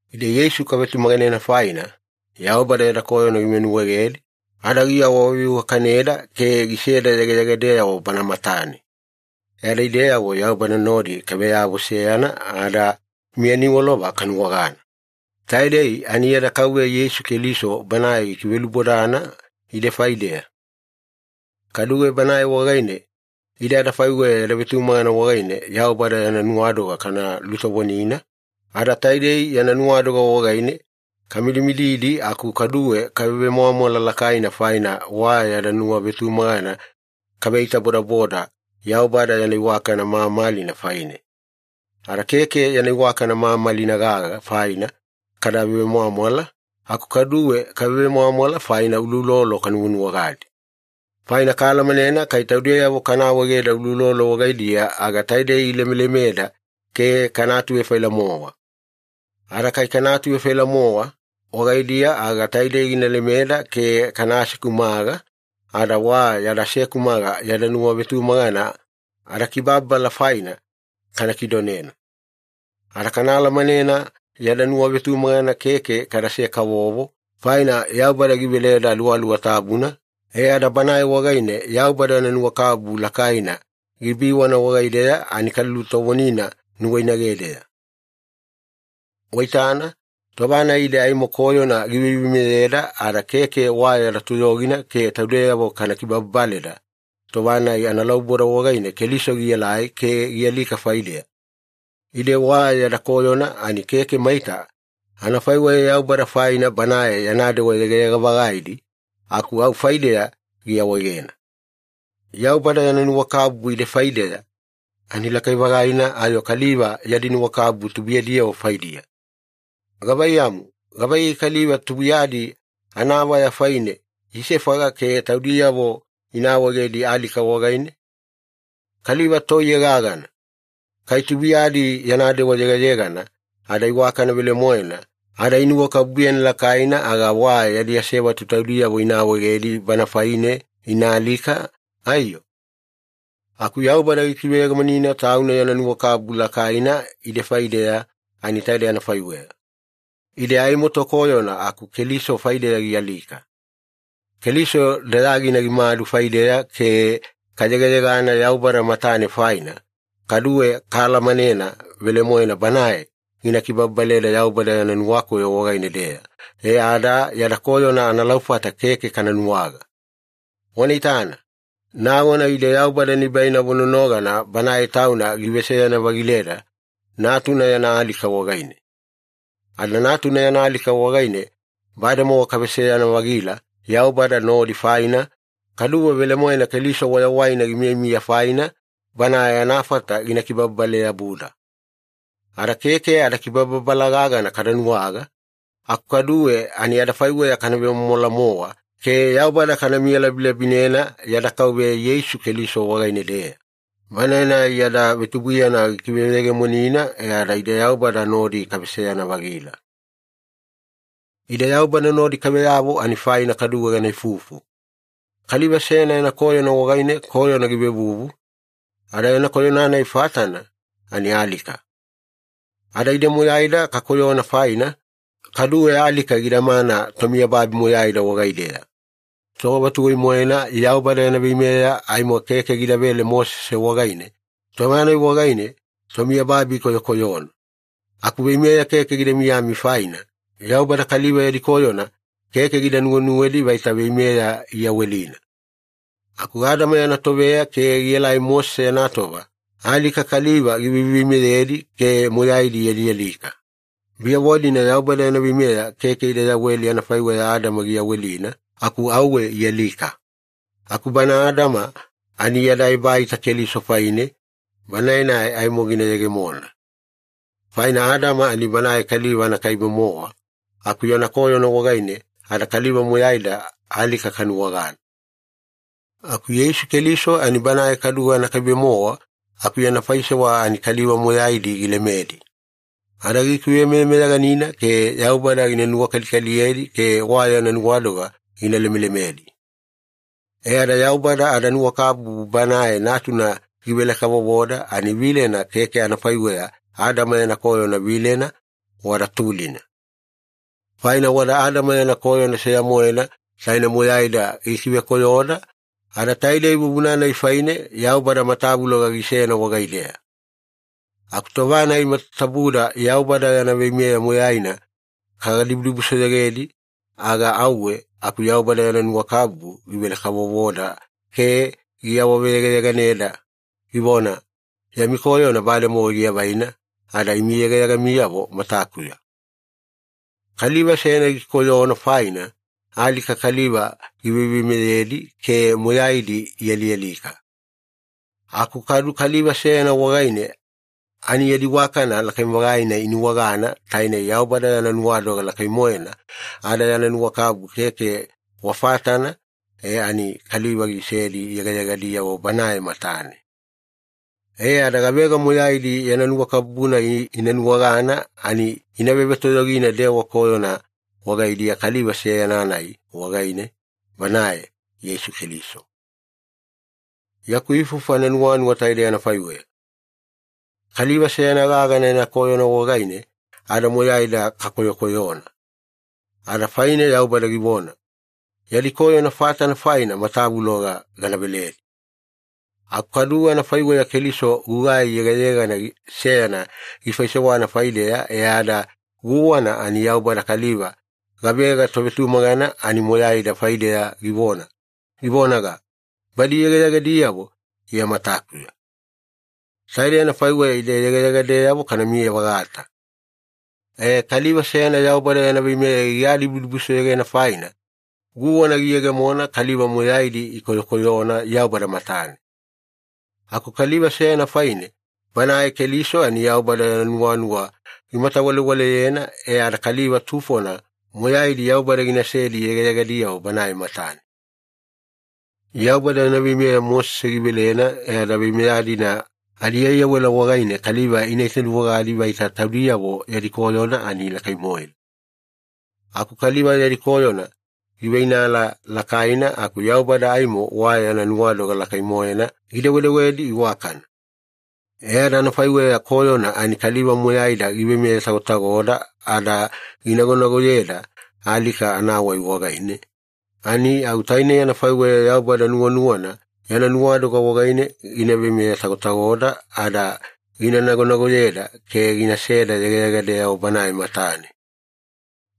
Ide Yeisu kavetumaganena faina, Yaubada yada koyona givenuwaegedi ada giawaveiwakaneda ke giseda yegayegadeyavo Bana matane, e ada ideyavo Yaubada nodi kaveyavo seyana ada miya niwalova kanuwagana. Taidei ani yada Kauveya Yeisu Keliso Banae gikivelaubodana ide faideya. Kaduwe Banae wagaine ide adafaiweya yada vetumagana wagaine Yaubada yana nuwadoga kana lulutovonina, ada taidei yana nuwadoga wagaine kamidimididi aku kaduwe kavemwamwala lakaina faina wa yada nuwavetumagana kaveitabodaboda Yaubada yana iwakana mamalina faine. Ada keke yana iwakana mamalina gaga faina kada vemwamwala, aku kaduwe kavemwamwala faina uloulolo kanuwanuwagadi. Faina kaalamanena kai taudeyavo kana awaegeda uloulolo wagaidiya, aga taidei ilemelemeda ke kana atuvefaila-mowa. Ada kai kana atuatuvefaila-mowa wagaidiya aga taidei gina lemeda ke kana asekumaga, ada wa yada asekumaga yada nuwavetumagana adakibababala faina kana kidonena. Ada kaalamanena yada nuwavetumagana keke kadase-kavovo, faina Yaubada giveleda Aluwaluwa Tabuna e ada Banae wagaine Yaubada yana nuwakabubu lakaina gibiwana wagaideya ani kalulutovonina nuwainagedeya. Waitana, tova-nai ide aimo koyona giveiveimeyeda ada keke wa yada toyogina ke taudeyavo kana kibababaleda, tova-nai analauboda wagaine Keliso gielai ke gialika faideya. Ide wa yada koyona ani keke maita anafaiweya Yaubada faina Banae yana dewa yegayega-vagaidi, aku au faideya giawaegena. Yaubada yana nuwakabubu ide faideya ani lakai-vagaina ayo kaliva yadi nuwakabubu tubuiyadiyavo faidiya. Gavaiyamu, gavaiyei kaliva tubuiyadi anayava faine isefaga ke taudiyavo ina awaegedi alika wagaine? Kaliva toiye gagana. Kai tubuiyadi yana dewa yegayegana ada iwakana velemoena ada inuwakabubuyena lakaina, aga wa yadi asevatu taudiyavo ina awaegedi bana faine ina alika, aiyo? Aku Yaubada gikiveyegemonina Tauna yana nuwakabubu lakaina ide faideya ani taidei anafaiweya. Ide aimo tokoyona, aku Keliso faideya gialika. Keliso dayagina gimadu faideya ke kayegayegana Yaubada matane faina, kaduwe kaalamanena velemoena Banae gina kibababaleda Yaubada yana nuwakoyo wagaine-deya e ada yada koyona analaufata keke kana nuwaga. Wana itana. Nagona ide Yaubada nibainavo nonogana Banae Tauna giveseyana-vagileda Natuna yana alika wagaine. Ada Natuna yana alika wagaine bademowa kaveseyana-vagila Yaubada nodi faina, kaduwe velemoena Keliso wayawaina gimiyamiya faina, Banae anafata gina kibababale-yabuda. Ada keke adakibababala gagana kada nuwaga, aku kaduwe ani adafaiweya kana vemwamwala-mowa ke Yaubada kana miyalabilabinena yada Kauveya Yeisu Keliso wagaine-deya, Banae-nai yada vetubuiyana gikiveyegemonina e ada ide Yaubada nodi kaveseyana-vagila. Ide Yaubada nodi kaveyavo ani faina kaduwe gana ifufu. Kaliva seyana yana koyona wagaine koyona givevuvu, ada yana koyona-nai fatana ani alika. Ada ide moyaida kakoyona faina, kaduwe alika gidamana tomiyababi moyaida wagaideya. Tova tuwai-moena Yaubada yana veimeya aimo keke gidavele Mosese wagaine, tova-nai wagaine tomiyababi ikoyokoyona. Aku veimeya keke gida miyami faina, Yaubada kaliva yadi koyona keke gida nuwenuwedi vaita veimeya iyawelina. Aku Adama yana toveya ke gielai Mosese yana tova, alika kaliva giveiveimeyedi ke moyaidi ialialika. Biyavo-dina Yaubada yana veimeya keke ida yaweli anafaiweya Adama giyawelina, aku auwe ialika. Aku bana Adama ani yada ebaita Keliso faine, Banae-nai aimo gina yegemona. Faina Adama ani banae kaliva anakaibe-mowa aku yana koyona wagaine ada kaliva moyaida alika kanuwagana. Aku Yeisu Keliso ani Banae kaduwe anakaibe-mowa aku yana faisewa ani kaliva moyaidi gilemedi, ada gikivemeyameyaganina ke Yaubada gina nuwakalikaliyedi ke wa yana nuwadoga gina lemelemedi. E ada Yaubada adanuwakabubu Banae Natuna givele-kavovoda ani vilena keke anafaiweya Adama yana koyona vilena, wada tulina. Faina wada Adama yana koyona seya-moena taine moyaida gikivekoyoda, ada taidei vuvuna-nai faine Yaubada matavuloga ginasena wagaideya. Aku tova-nai matatabuda Yaubada yana veimeya moyaina kagadibudibusoyogedi, aga auwe aku Yaubada yana nuwakabubu givele-kavovoda ke giawaveyegayeganeda, givona, “Yami koyona bademowa giavaina ada imi yegayegamiyavo matakuya.” Kaliva seyana gikoyona faina, alika kaliva giveiveimeyedi ke moyaidi ialialika. Aku kadu Kaliva seyana wagaine ani yadi iwakana lakai-vagaina inuwagana, tainei Yaubada yana nuwadoga lakai-moena ada yana nuwakabubu keke wa fatana e ani kaliva gisedi yegayegadiyavo Banae matane. E ada gavega moyaidi yana nuwakabubu-nai ina nuwagana ani ina vevetoyogina dewa koyona wagaidiya Kaliva seyana-nai wagaine, Banae Yeisu Keliso. Yaku ifufu ananuwanuwa taidei anafaiweya. Kaliva seyana gaga yana koyona wagaine ada moyaida kakoyokoyona, ada faine Yaubada givona, “Yadi koyona fatana faina matavuloga gana veledi.” Aku kaduwe anafaiweya Keliso gugai yegayegana seyana gifaisewana faideya e ada guwana ani Yaubada kaliva gavega tovetumagana ani moyaida faideya givona, givonaga, “Badi yegayegadiyavo Iya matakuya.” Taide anafaiweya ide yegayegadeyavo kanamiya-vagata. E, kaliva seyana Yaubada yana veimeya gigadibusoyogena faina, guwana giyegemona kaliva moyaidi ikoyokoyona Yaubada matane. Aku kaliva seyana faine, Banae Keliso ani Yaubada yana nuwanuwa gimatawalewaleyena e ada kaliva tufona moyaidi Yaubada ginasedi yegayegadiyavo Banae matane. Yaubada yana veimeya Mosese givelena e ada veimeya-dina adiaiyawela wagaine kaliva ina itanuwagadi vaita taudiyavo yadi koyona ani lakai-moena. Aku kaliva yadi koyona giveinala lakaina aku Yaubada aimo wa yana nuwadoga lakai-moena gidewedewedi iwakana. E ada anafaiweya koyona ani kaliva moyaida giveimeye tagotagoda ada ginagonagoyeda alika anawai wagaine, ani au taine anafaiweya Yaubada nuwanuwana yana nuwadoga wagaine gina veimeye-tagotagoda ada gina nagonagoyeda ke ginaseda yegayegadeyavo Banae matane.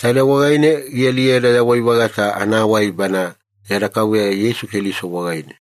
Taidei wagaine gina aliyeda yawai-vagata anawai Bana yada Kauveya Yeisu Keliso wagaine.